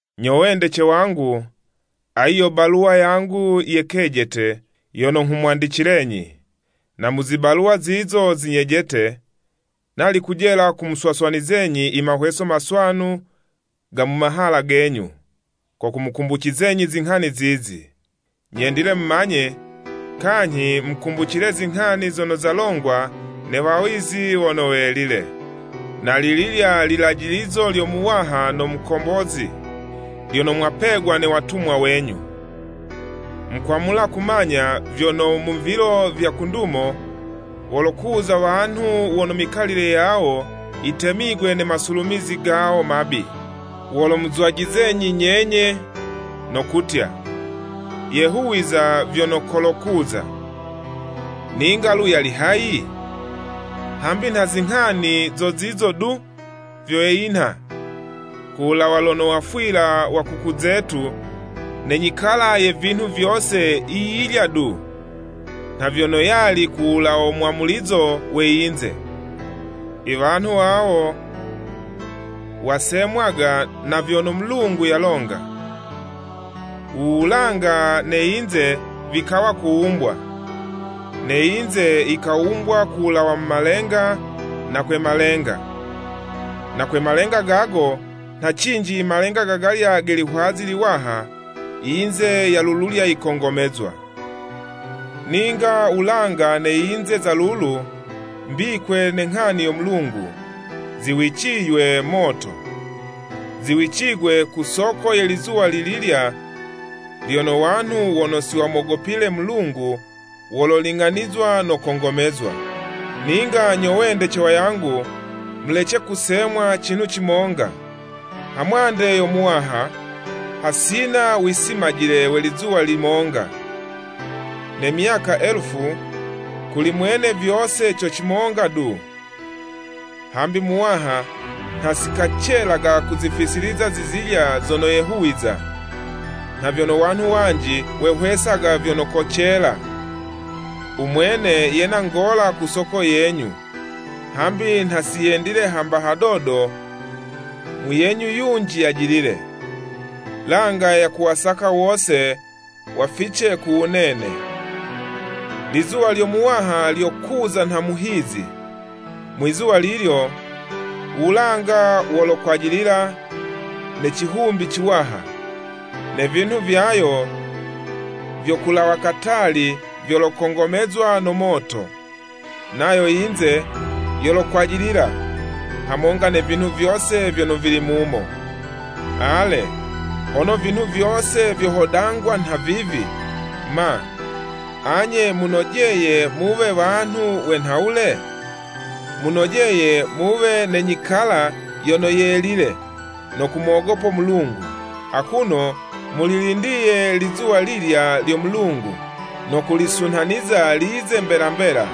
Nyo wendece wangu, ayi yo baluwa yangu ye kejete yono nghumwandicilenyi. Na mu zibaluwa zizo zinyejete, nali kujela kumuswaswanizenyi i mahweso maswanu ga mu mahala genyu, ko kumukumbucizenyi zinghani zizi. Nyendile mumanye, kanyhi mukumbicile zinghani zono zalongwa ne wawizi wono welile, na lililya lilajilizo lyo Muwaha no Mukombozi, lyono mwapegwa ne watumwa wenyu. Mukwamula kumanya vyono mu vilo vya ku ndumo wolokuza wanhu wono mikalile yawo yitemigwe ne masulumizi gawo mabi. Wolomuzwajizenyi nyenye, no kutya, “Yehuwiza vyono kolokuza! Ninga lu yali hayi? Hambi nha zinghani zo zizo du vyo yinha, ku wulawa lono wafwila wa kuku zetu ne nyikala ye vinhu vyo yiyilya du, nha vyono yali kulawo mwamulizo we yinze!” Iwanhu wawo, wasemwaga na vyono Mulungu yalonga, u wulanga ne yinze vikawa kuwumbwa. Ne yinze yikawumbwa ku wulawa mu malenga, na kwe malenga, na kwe malenga gago nha cinji i malenga gagalya ge lihwazi liwaha, yinze ya lululya yikongomezwa. Ninga wulanga ne yinze za lulu mbikwe ne nghani yo Mulungu, ziwiciywe moto. Ziwicigwe ku soko ye lizuwa lililya lono wanhu wono siwamogopile Mulungu wololing'anizwa no kongomezwa. Ninga nyo wendece wangu, mulece kusemwa cinhu cimonga! Hamwande yo Muwaha, hasina wisimajile we lizuwa limonga, ne myaka elufu, kuli mwene vyose co cimonga du. Hambi Muwaha nha sikacelaga kuzifisiliza zizilya zono yehuwiza, nha vyono wanhu wanji wehwesaga vyono kocela. Umwene yena ngola ku soko yenyu, hambi nha siyendile hamba hadodo muyenyu yunji yajilile, langa yakuwasaka wose wafice ku wunene. Lizuwa lyo Muwaha lyolokuza nha muhizi. Mwizuwa lilyo, wulanga wolokwajilila ne cihumbi ciwaha, ne vinhu vyayo vyo kulawa katali vyolokongomezwa no moto, nayo yinze yolokwajilila, hamonga ne vinhu vyose vyono vili mumo. Ale, hono vinhu vyose vyohodangwa nha vivi, ma, anye munojeye muwe wanhu we nha wule? Munojeye muwe ne nyikala yono yelile no kumogopo Mulungu, akuno mulilindiye lizuwa lilya lyo Mulungu, no kulisunhaniza lize mbela mbela,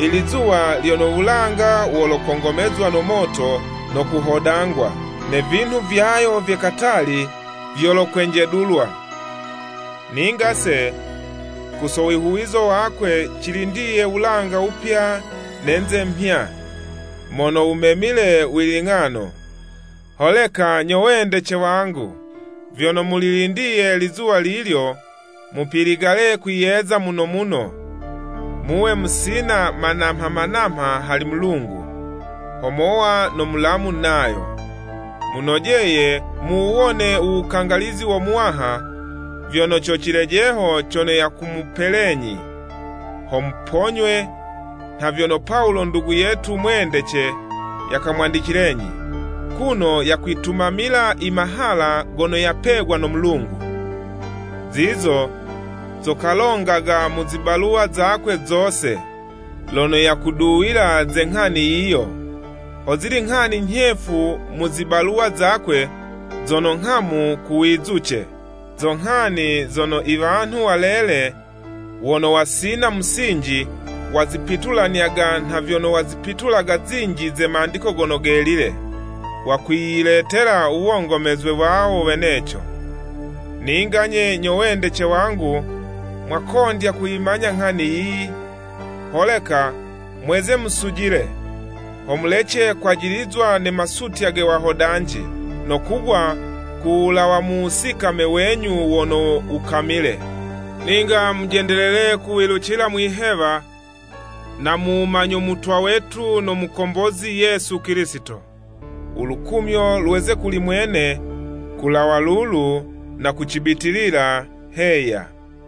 i lizuwa lyono wulanga wolokongomezwa no moto no kuhodangwa, ne vinhu vyayo vye katali, vyolokwenjedulwa. Ninga'se, ku so wihuwizo wakwe, cilindiye wulanga wupya ne'nze mhya, mono wumemile wiling'ano. Holeka nyo wendece wangu, vyono mulilindiye lizuwa lilyo, mupiligale kwiyeza muno muno, muwe musina manamha-manamha hali Mulungu, ho mowa no mulamu nayo. Munojeye muwuwone u wukangalizi wo Muwaha, vyono co cilejeho cono yakumupelenyi, ho muponywe, nha vyono Pawulo ndugu yetu mwendece yakamwandicilenyi, kuno yakwitumamila i mahala gono yapegwa no Mulungu. Zizo zo kalongaga mu zibaluwa zakwe zose, lono yakuduwila ze nghani yiyo. Hozili nghani nyhefu mu zibaluwa zakwe zono nghamu kuwizuce, zo nghani zono i wanhu walele, wono wasina musinji wazipitulanyaga nha vyono wazipitulaga zinji ze Mandiko Gono Gelile. Wakwiyiletela uwongomezwe wawo weneco. Ninga'nye, nyo wendece wangu, mwakondya kuyimanya nghani yiyi, holeka mweze musujile, ho mulece kwajilizwa ne masutya ge wahodanji, no kugwa ku wulawa mu wusikame wenyu wono wukamile. Ninga mujendelele kuwilucila mwihewa no mu wumanyo Mutwa wetu no Mukombozi Yesu Kilisito. U lukumyo lweze kuli mwene, kulawa lulu na ku cibitilila Heya.